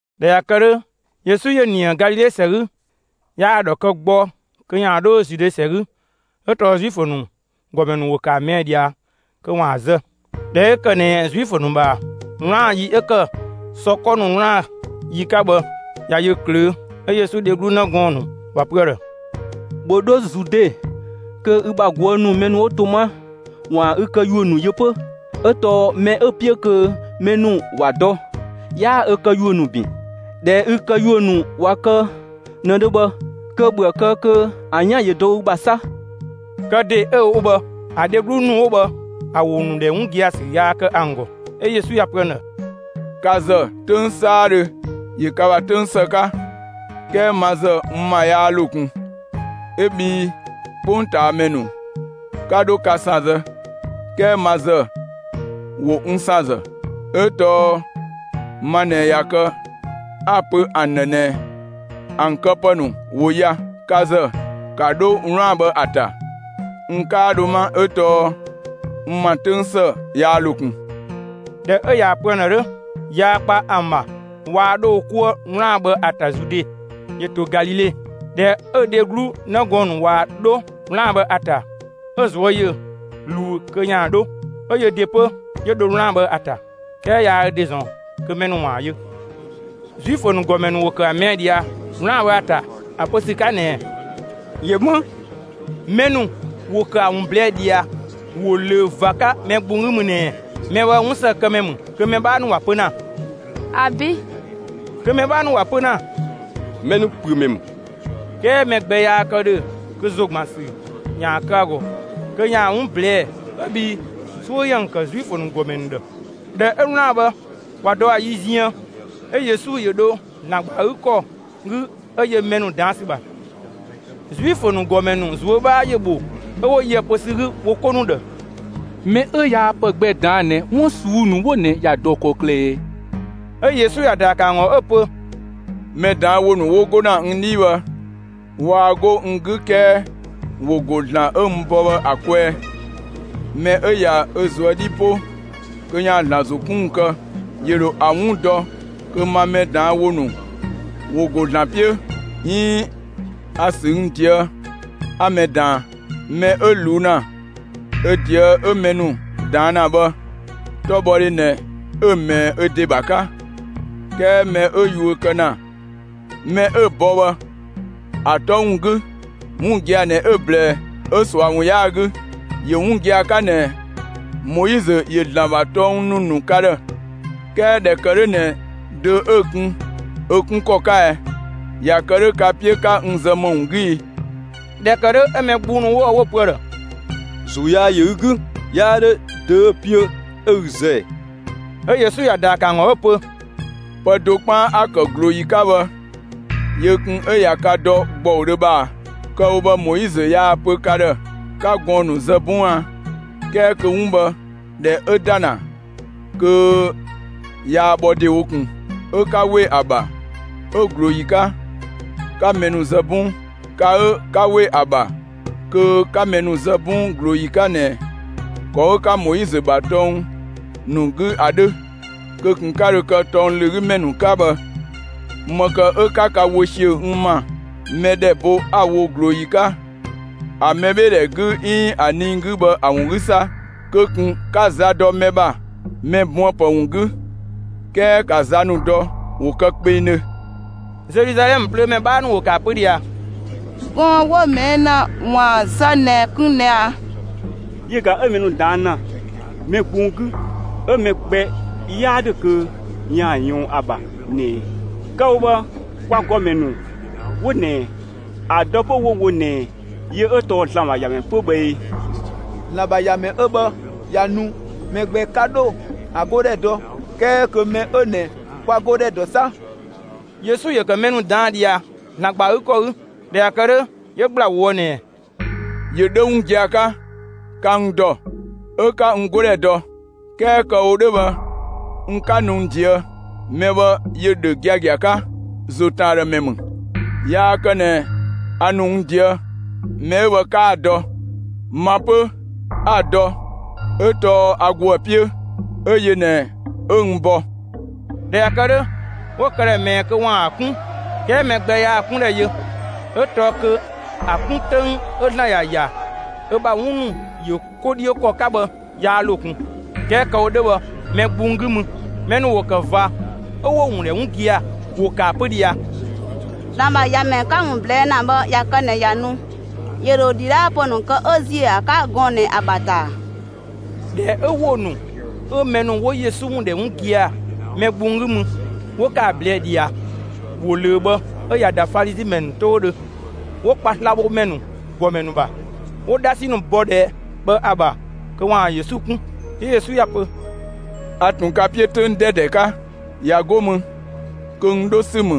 ꞊Dhɛ ꞊ya kë 'dhö, Yesu ‑yö ‑nië Galile ‑sɛ 'gü; yaa‑ ‑dhɔ kë gbɔ kö ‑yaan 'dho Zude ‑sɛ 'gü 'ö tɔɔ Zuifö ‑nu ‑gɔmɛ ‑nu ‑wo ‑kë ‑a ꞊mɛɛ' ꞊dhia kö ‑waan ‑a zë. ꞊Dhɛ 'ö ‑kë ꞊nɛ Zuifö ‑nu ‑bha 'wlaan‑ ‑yi 'ö ‑kë sɔ 'kɔ ‑nu 'wlaan‑ ‑yi 'ka bhë, ꞊ya yö ꞊klöö', 'Ö Yesu dheglu 'në gɔɔn‑ ‑nu ‑wa pö ‑a ‑dhë: «‑Bhö 'dho Zude kö ü ‑bha ꞊guë' ‑nu (mɛ 'wo to 'ma) ‑waan ü këyuö ‑nu yö 'pö. 'Ö tɔɔ mɛ 'ö‑ 'piö kö mɛ ‑nu ‑wa dɔ, 'yaa ö këyuö ‑nu ‑bin. ꞊Dhɛ ü këyuö ‑nu ꞊wa kë ꞊nëdhö bhë, kö ‑bhöë kë kö ‑an 'yan ‑yö dɔ ü ‑bha 'sa!» Kë ‑de 'ö‑ wo bhë, ‑a dheglu ‑nu 'wo bhë, ‑a ‑wo ‑nu ‑dhɛ 'wun gia‑ ‑sü yaa kë ‑an ‑gɔ. 'Ö Yesu ‑ya pö ‑an ‑dhë: «Ka ‑zë 'töng 'saadhö ‑yö ka ‑bha 'töng ‑së 'ka, 'kɛɛ ma ‑zë n ‑ma yaa ‑lo ꞊kun. 'Ö bhii 'kpongtaamɛ ‑nu 'ka 'dho ka ‑san zë; 'kɛɛ ma ‑zë ‑wo n ‑san ‑zë, 'ö tɔɔ ma ꞊nɛ ꞊ya kë 'a‑ pö ‑an ‑dhë ꞊nɛ ‑an këpë ‑nu ‑wo ya. Ka ‑zë, ‑ka 'dho 'wlaan‑ bhë ‑a ‑ta. N 'kaa dho 'ma, 'ö tɔɔ n ‑ma 'töng ‑së yaa ‑lo ꞊kun.» ꞊Dhɛ 'ö ꞊yaa‑ pö ‑an ‑dhë 'dhö, (yaa kpa ‑an ‑bha waa 'dho wo 'kuë 'wlaan‑ bhë ‑a ‑ta Zude,) ‑yö ‑to Galile. ꞊Dhɛ 'ö‑ dheglu 'në gɔɔn‑ ‑nu ꞊wa 'dho 'wlaan‑ bhë ‑a ‑ta, 'ö‑ ꞊zuö' ‑yö ꞊luu kö ‑yaan 'dho; 'ö yö ‑de 'pö, 'yö dho 'wlaan‑ bhë ‑a ‑ta; 'kɛɛ yaa ö ‑de ‑zɔn kö mɛ ‑nu ‑waan yö. Zuifö ‑nu ‑gɔmɛ ‑nu ‑wo ‑kë ‑a ꞊mɛɛ' ꞊dhia 'wlaan‑ bhë ‑a ‑ta ‑a pö ‑sü 'ka ꞊nɛɛ: «‑Yö 'më?» Mɛ ‑nu ‑wo ‑kë ‑a ‑wun ꞊blɛɛ' ꞊dhia ‑wo ꞊löö ꞊va 'ka mɛ gbung 'gü mü ꞊nɛɛ: «Mɛ bhë 'wunsëkëmɛ ‑mü», kö mɛ 'bhaa ‑nu ‑wa pö ‑na: «‑Abi'!» kö mɛ 'bhaa ‑nu ‑wa pö ‑na: «Mɛ ‑nu ‑püö ‑mɛ ‑mü.» 'Kɛɛ mɛ gbɛ yaa kë ‑dhö kö ‑zogbansü ‑yaan kë ‑a ‑gɔ kö ‑yaan ‑wun ꞊blɛɛ'‑, 'ö bhii 'suö ‑yö ‑an ‑kë Zuifö ‑nu ‑gɔmɛ ‑nu ‑dhë. ꞊Dhɛ 'ö 'wlaan‑ bhë ꞊wa dɔ ‑a yi ziën, 'ö Yesu ‑yö dho ‑Zlan ‑gba ‑a 'gü ‑kɔ 'gü, 'ö yö mɛ ‑nu ꞊daan' ‑sü ‑bha. Zuifö ‑nu ‑gɔmɛ ‑nu ꞊zuö' 'bhaa ‑yö ‑bho, 'ö 'wo yö ‑a pö ‑sü 'gü wo 'ko ‑nu ‑dhë: «Mɛ 'ö yaa pë gbɛ ꞊daan' ꞊nɛ 'wun ꞊suu'‑ ‑nu 'wo ꞊nɛ ‑ya ‑dɔ ‑kɔklë ꞊ɛɛ?» 'Ö Yesu ‑ya ‑daa ‑kë ‑an ‑gɔ 'ö‑ pö: «Mɛ ꞊daan' ‑wo ‑nu 'wo 'go ‑na n 'dhii bhë, waa 'go n 'gü 'kɛɛ ‑wo ‑go ‑Zlan 'ö n bɔ bhë ‑a kwɛɛ. Mɛ 'ö ꞊ya ö ꞊zuö' 'dhi 'po kö ‑yaan ‑Zlan ‑zo 'kun ‑wun kë, ‑yö ‑dho ‑a 'wun dɔ kö ma mɛ ꞊daan' ‑wo ‑nu ‑wo ‑go ‑Zlan 'piö 'iin a‑ ‑sü n ꞊deë' 'a mɛ ꞊daan. Mɛ 'ö ꞊luu' ‑na ö ꞊deë' 'ö mɛ ‑nu ꞊daan' ‑na bhë, 'tɔbhɔdhe ꞊nɛ 'ö‑ ꞊mɛɛ ö ‑de ‑bha 'ka; 'kɛɛ mɛ 'ö yuö kë ‑na mɛ 'ö‑ bɔ bhë ‑a 'tɔ ‑wun 'gü, 'wun gia‑ ꞊nɛ 'ö‑ ꞊blɛɛ, 'ö ꞊sua ‑wun 'yaa‑ 'gü. ‑Yö 'wun gia‑ 'ka ꞊nɛ Moizö ‑yö (‑Zlan ‑bha) tɔng ‑nu ‑nu ka ‑dhë. 'Kɛɛ ꞊dhɛ ‑kë 'dhö ꞊nɛ dö 'ö‑ kun ö 'kun ‑kɔ 'ka ɛɛ? ꞊Ya kë 'dhö ka‑ 'piö 'ka n zë ‑më ‑wun 'gü ii?» ꞊Dhɛ ‑kë 'dhö 'ö mɛ gbung ‑nu 'wo bhë 'wo‑ pö ‑a ‑dhë: «‑Zuu yaa ‑yö ü 'gü! 'Yaa 'dhö dö 'ö‑ 'piö 'ö ü zë ꞊ɛɛ?» 'Ö Yesu ‑ya ‑daa ‑kë ‑an ‑gɔ 'ö‑ pö: «Pë do 'kpaan 'a‑ ‑kë ꞊glooyi 'ka bhë yö kun 'ö ꞊ya ka dɔ ‑gbɔudhö bhë ꞊a! Kë‑ wo bhë Moizö yaa‑ pö ka ‑dhë 'ka gɔɔn‑ ‑nu zë 'bɔng a? ('Kɛɛ kö 'wun bhë ꞊dhɛ 'ö ‑da ‑na kö yaa bhɔ ‑dewo ꞊kun); 'ö 'ka ‑we ‑a ‑bha 'ö ꞊glooyi 'ka, 'ka mɛ ‑nu zë 'bɔng. Ka 'ö ka 'we ‑a ‑bha kö 'ka mɛ ‑nu zë 'bɔng ꞊glooyi 'ka ꞊nɛ ‑kɔ 'ö 'ka Moizö ‑bha tɔng ‑nu 'gü ‑a 'dhö, kö ꞊kun 'ö 'ka dho kë tɔng ‑lö 'gü ‑mɛ ‑nu 'ka bhë, ‑më ‑kë 'ö 'ka ka wö ‑siö n ‑ma mɛ ‑dhɛ bo 'a‑ wo ꞊glooyi 'ka, ‑a mɛbheedhɛ 'gü 'iin ‑a nii 'gü bhë ‑a ‑wun 'gü 'sa? Kö ꞊kun 'ka za dɔ mɛ ‑bha mɛ buënpë ‑wun 'gü, 'kɛɛ 'ka za ‑nu dɔ, ‑wo kë kpengdhö.» Zeluzalɛmë plöömɛ 'bhaa ‑nu ‑wo ‑kë ‑a pö ꞊dhia: «Gɔɔn‑ 'wo‑ ꞊mɛɛ' ‑na ‑waan zë ꞊nɛ kun ꞊nɛ ꞊a? Yö ꞊ga 'ö mɛ ‑nu ꞊daan' ‑na mɛ gbung 'gü 'ö mɛ gbɛ 'yaa 'dhö kö ‑yö ꞊yɔɔn ‑a ‑bha ꞊nɛ! Kë‑ wo bhë, kwa ‑gɔmɛ ‑nu 'wo ꞊nɛ ‑a dɔ 'pö 'wo‑ wo ꞊nɛ yö 'ö tɔɔ ‑Zlan ‑bha ‑Yamɛ 'pö bhë ee? ‑Zlan ‑bha ‑Yamɛ 'ö bhë ꞊ya nu, mɛ gbɛ 'ka 'dho ‑a 'godhɛ dɔ, 'kɛɛ kö mɛ 'ö ꞊nɛ kwa‑ 'godhɛ ‑dɔ 'sa!» Yesu ‑yö ‑kë mɛ ‑nu ꞊daan' ꞊dhia ‑Zlan ‑gba ‑a 'gü ‑kɔ 'gü. ꞊Dhɛ ꞊ya kë 'dhö, 'yö ‑gbla ꞊woë' ꞊nɛɛ: «‑Yö 'dhö 'wun gia‑ 'ka, ka n ‑dɔ, 'ö 'ka n 'godhɛ dɔ. 'Kɛɛ kë‑ wo 'dhö bhë n 'ka nu n ꞊deë'. Mɛ bhë ‑yö ‑dhö giagia 'ka; ‑zo ‑tën ‑a ‑dhë ‑mɛ ‑mü. Yaa kë ꞊nɛ a ‑nu n ꞊deë'. Mɛ 'ö bhë 'kaa‑ dɔ. Ma 'pö, 'a‑ dɔ 'ö tɔɔ a ‑go ‑a 'piö, 'ö yö ꞊nɛ 'ö n bɔ.» ꞊Dhɛ ꞊ya kë 'dhö, 'wo‑ këdhɛ ꞊mɛɛ kö ‑waan ‑a 'kun; 'kɛɛ mɛ gbɛ yaa‑ 'kundhɛ yö, 'ö tɔɔ kö ‑a 'kun 'töng 'ö ‑Zlan ‑ya ‑ya ö ‑bha 'wun ‑nu ‑yö 'ko 'dhiö ‑kɔ 'ka bhë yaa ‑lo ꞊kun. 'Kɛɛ kë‑ wo 'dhö bhë mɛ gbung 'gü mü, mɛ ‑nu ‑wo ‑kë ꞊va 'ö 'wo‑ ‑wun ‑dhɛ 'wun gia‑. ‑Wo ‑kë ‑a pö ꞊dhia: «‑Zlan ‑bha ‑Yamɛ 'ka‑ ‑wun ꞊blɛɛ' ‑na bhë, ꞊ya kë ꞊nɛ ꞊ya nu, ‑yö ‑dho ‑dhidhaapë ‑nu kë 'ö ‑ziö ‑a 'ka gɔɔn‑ ꞊nɛ ‑a ‑bha ‑ta ‑a?» ꞊Dhɛ 'ö ‑wo ‑nu 'ö mɛ ‑nu 'wo Yesu ‑wun ‑dhɛ 'wun gia‑ mɛ gbung 'gü mü, 'wo ‑kë ꞊blɛɛ' ꞊dhia ‑wo ꞊löö bhë 'ö ꞊ya ‑da Falizi ‑mɛ ‑nu 'toudhö, 'wo kpa slabhomɛ ‑nu ‑gɔmɛ ‑nu ‑bha, 'wo 'dhasi ‑nu bɔ ‑dhɛ bhë ‑a ‑bha kö ‑waan Yesu 'kun. 'Yö Yesu ‑ya pö: «A ꞊tun ka 'piö 'töng 'dɛdɛ 'ka; ꞊ya 'go mü kö n 'dho ‑sü ‑mü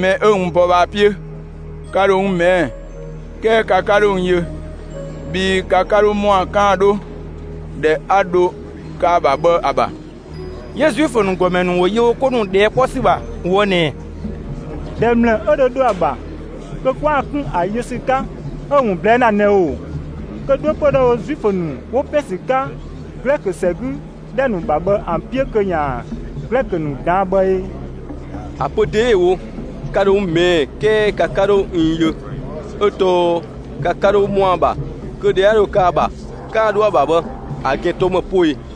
mɛ 'ö n bɔ bhë ‑a 'piö. Ka ‑dho n ꞊mɛɛ', 'kɛɛ ka 'ka 'dho n yö, bhii ka 'ka 'dho ‑mɔa 'kaan‑ 'dho ‑dhɛ 'a dho kë ‑a ‑bha bhë ‑a ‑bha.» 'Yö Zuifö ‑nu ‑gɔmɛ ‑nu ‑wo yö wo 'ko ‑nu ꞊dhɛɛ' 'kpɔ ‑sü ‑bha ꞊woë' ꞊nɛɛ: «‑Dhɛ ‑mlë 'ö dho dho ‑a ‑bha kö 'kwaan‑ 'kun ‑a yö ‑sü 'ka 'ö‑ ‑wun ꞊blɛɛ' ‑na ꞊nɛ ‑oo? Kö 'dho 'pö dhoë‑ wo Zuifö ‑nu 'wo ‑pɛn ‑sü 'ka Glɛkö ‑sɛ 'gü ‑dhɛ ‑nu ‑bha bhë ‑an 'piö kö ‑yaan Glɛkö ‑nu ꞊daan' bhë ee? ‑A pö ‑de 'ö‑ wo ‹ka ‑dho n ꞊mɛɛ' 'kɛɛ ka 'ka 'dho n yö 'ö tɔɔ ka 'ka 'dho ‑mɔa ‑bha kö ‑dhɛ 'a dho kë ‑a ‑bha, 'kaan‑ 'dho ‑a ‑bha› bhë, ‑a ‑gɛn tɔɔ ‑më poo ꞊ee?»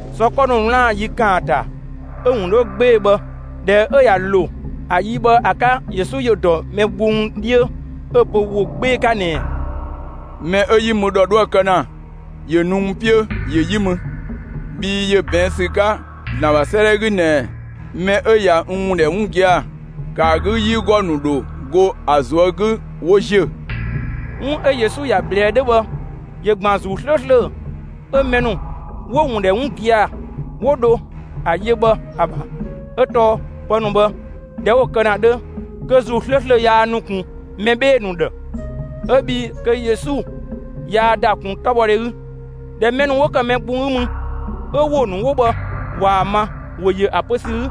Sɔ 'kɔ ‑nu 'wlaan‑ ‑yi ‑kaanta 'ö‑ ‑wun 'dhö 'gbee‑ bhë, ꞊dhɛ 'ö ꞊ya ‑lo, ‑a yi bhë ‑a 'ka, Yesu ‑yö ‑dɔ mɛ gbung 'dhiö 'ö‑ pö ‑wo 'gbee‑ 'ka ꞊nɛɛ: «Mɛ 'ö 'yi mü ‑dhɔ 'dhoë‑ kë ‑na, ‑yö nu n 'piö, ‑yö 'yi mü. Bhii ‑yö ꞊bɛɛn' ‑sü 'ka ‑Zlan ‑bha 'sëëdhɛ 'gü ꞊nɛɛ: Mɛ 'ö ꞊ya n ‑wun ‑dhɛ 'wun gia‑, ‑kë ‑a 'gü 'yigɔ ‑nu ‑dho go ‑a ꞊zuö' 'gü 'wo ‑ziö.» 'Wun 'ö Yesu ‑ya ꞊blɛɛ 'dhö bhë ‑yö ‑gban ‑Zuu 'slööslö 'ö mɛ ‑nu 'wo‑ ‑wun ‑dhɛ 'wun gia‑, 'wo dho ‑a yö bhë ‑a ‑bha; 'ö tɔɔ pë ‑nu bhë, ꞊dhɛ 'wo kë ‑na 'dhö, kö ‑Zuu 'slööslö yaa nu ꞊kun mɛ 'bhee‑ ‑nu ‑dhë, 'ö bhii kö Yesu yaa ‑da ꞊kun 'tɔbhɔdhe 'gü. ꞊Dhɛ mɛ ‑nu 'wo ‑kë mɛ gbung 'gü mü, 'ö ‑wo ‑nu 'wo bhë ꞊waa‑ ma, ‑wo ‑yö ‑a pö ‑sü 'gü: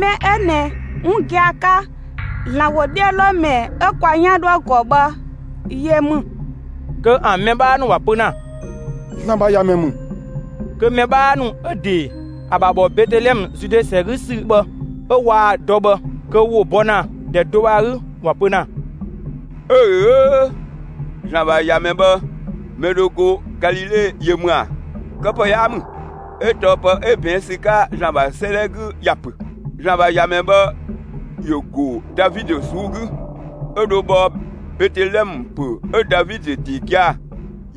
«Mɛ 'ö ꞊nɛ, 'wun gia‑ 'ka, ‑Zlan ‑wodhiölomɛ 'ö kwa 'yan 'dhoë‑ ‑gɔ bhë yö ‑mü!» Kö ‑an mɛ 'bhaa ‑nu ‑wa pö ‑na: «‑Zlan ‑bha ‑Yamɛ ‑mü!» Kö‑ mɛ 'bhaa ‑nu ('ö‑ ‑de, ‑a ‑bha ‑bhɔ Betelɛmë, Zude ‑sɛ 'gü ‑sü bhë 'ö 'waa‑ dɔ bhë), kö ‑wo bɔ ‑na ‑dhɛ do bhë ‑a 'gü ‑wa pö ‑na: «'Öö‑ 'öö, ‑Zlan ‑bha ‑Yamɛ bhë, mɛ dho go Galile yö ‑mü ‑a? (Këpë 'yaa ‑mü,) 'ö tɔɔ pë 'ö ꞊bɛɛn' ‑sü 'ka ‑Zlan ‑bha 'sëëdhɛ 'gü ‑ya ‑pö: ‑Zlan ‑bha ‑Yamɛ bhë ‑yö ‑go Davidö ꞊suu'‑ 'gü, 'ö dho bhɔ Betelɛmë ‑pö 'ö Davidö (‑de gia‑)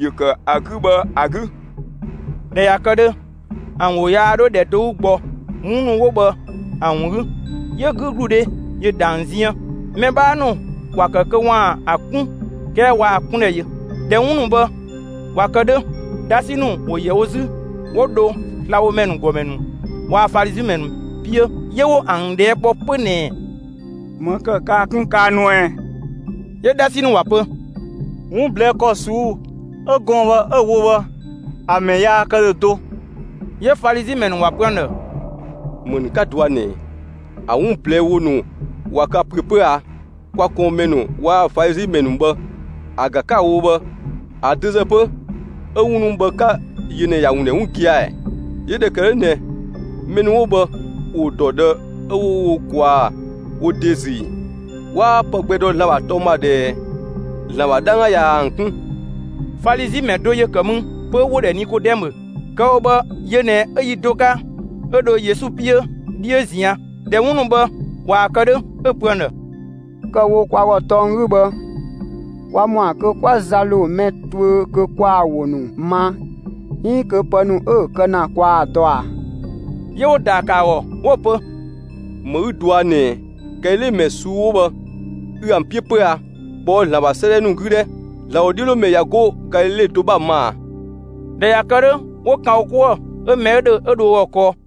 ‑yö ‑kë ‑a 'gü bhë ‑a 'gü.» ꞊Dhɛ ꞊ya kë 'dhö, ‑an ‑wo yaa 'dho ‑dhɛ do 'gü gbɔ 'wun ‑nu 'wo bhë ‑an ‑wun 'gü; 'yö 'gügludhe ‑yö ‑da ‑an ziën. Mɛ 'bhaa ‑nu ‑wa ‑kë kö ‑waan ‑a 'kun 'kɛɛ waa‑ 'kundhɛ yö. ꞊Dhɛ 'wun ‑nu bhë ꞊wa kë 'dhö, 'dhasi ‑nu ‑wo ‑yɛ wo 'zü 'wo dho slabhomɛ ‑nu ‑gɔmɛ ‑nu waa‑ Falizi ‑mɛ ‑nu 'piö; 'yö 'wo ‑an ꞊dhɛɛ' kpɔ 'pö ꞊nɛɛ: «‑Më ‑kë kaa‑ 'kun kaa nuë ꞊ɛ?» 'Yö 'dhasi ‑nu ‑wa pö: «'Wun ꞊blɛɛ' ‑kɔ ꞊suu'‑ 'ö gɔɔn‑ bhë 'ö‑ wo bhë, ‑a ‑mɛ yaa kë ‑dhö do!» 'Yö Falizi ‑mɛ ‑nu ‑wa pö ‑an ‑dhë: «‑Më ‑nu 'ka dɔa ꞊nɛ; ‑a 'wun ꞊blɛɛ' ‑wo ‑nu ꞊wa ka ‑püö 'pö a? Kwa ꞊kɔɔnmɛ ‑nu waa‑ Falizi ‑mɛ ‑nu bhë, ‑a ‑ga 'ka‑ wo bhë, ‑a dö ‑zë 'pö 'ö 'wun ‑nu bhë 'ka‑ yö ꞊nɛ ꞊ya ‑an ‑dhɛ 'wun gia‑? 'Yö ꞊dhɛ ‑kë 'dhö ꞊nɛ mɛ ‑nu 'wo bhë ‑wo ‑dɔ ꞊dhë 'ö 'wo wo ꞊kwaa wo ‑de ‑zü ‑ii? 'Waa pë gbɛ dɔ ‑Zlan ‑bha tɔng ‑bha ꞊dhɛɛ! ‑Zlan ‑bha 'dhangga ꞊ya ‑an 'kun.» Falizi ‑mɛ do ‑yö ‑kë mü 'pö, 'wo‑ ‑dhɛ Nikodɛmö. Kë‑ wo bhë, yö ꞊nɛ 'ö yi do 'ka 'ö dho Yesu 'piö 'dhiö ꞊zian'. ꞊Dhɛ 'wun ‑nu bhë ꞊wa kë 'dhö, 'ö‑ pö ‑an ‑dhë: «Kë‑ wo kwa ‑gɔ tɔng 'gü bhë, kwa ‑mɔa kö 'kwa za ‑lo mɛ tuö kö kwaa‑ ‑wo ‑nu ma 'iin kö pë ‑nu 'ö‑ kë ‑na kwaa‑ dɔ ꞊a?» 'Yö 'wo‑ ‑daa ‑kë ‑a ‑gɔ 'wo‑ pö: «‑Më 'ü dɔa ꞊nɛɛ! Galile ‑mɛ ꞊suu'‑ 'wo bhë ü ‑an 'piö 'pö a? ꞊Kpɔɔ'‑ ‑Zlan ‑bha 'sëëdhɛ ‑nu 'gü 'dhɛ! ‑Zlan ‑wodhiölomɛ ꞊ya 'go Galile do 'bha‑ ma ꞊a?» [꞊Dhɛ ꞊ya kë 'dhö, 'wo ‑kan wo 'kuë‑ 'ö mɛ 'ö ‑dhö, 'ö dho ö ‑gɔ kɔɔ.]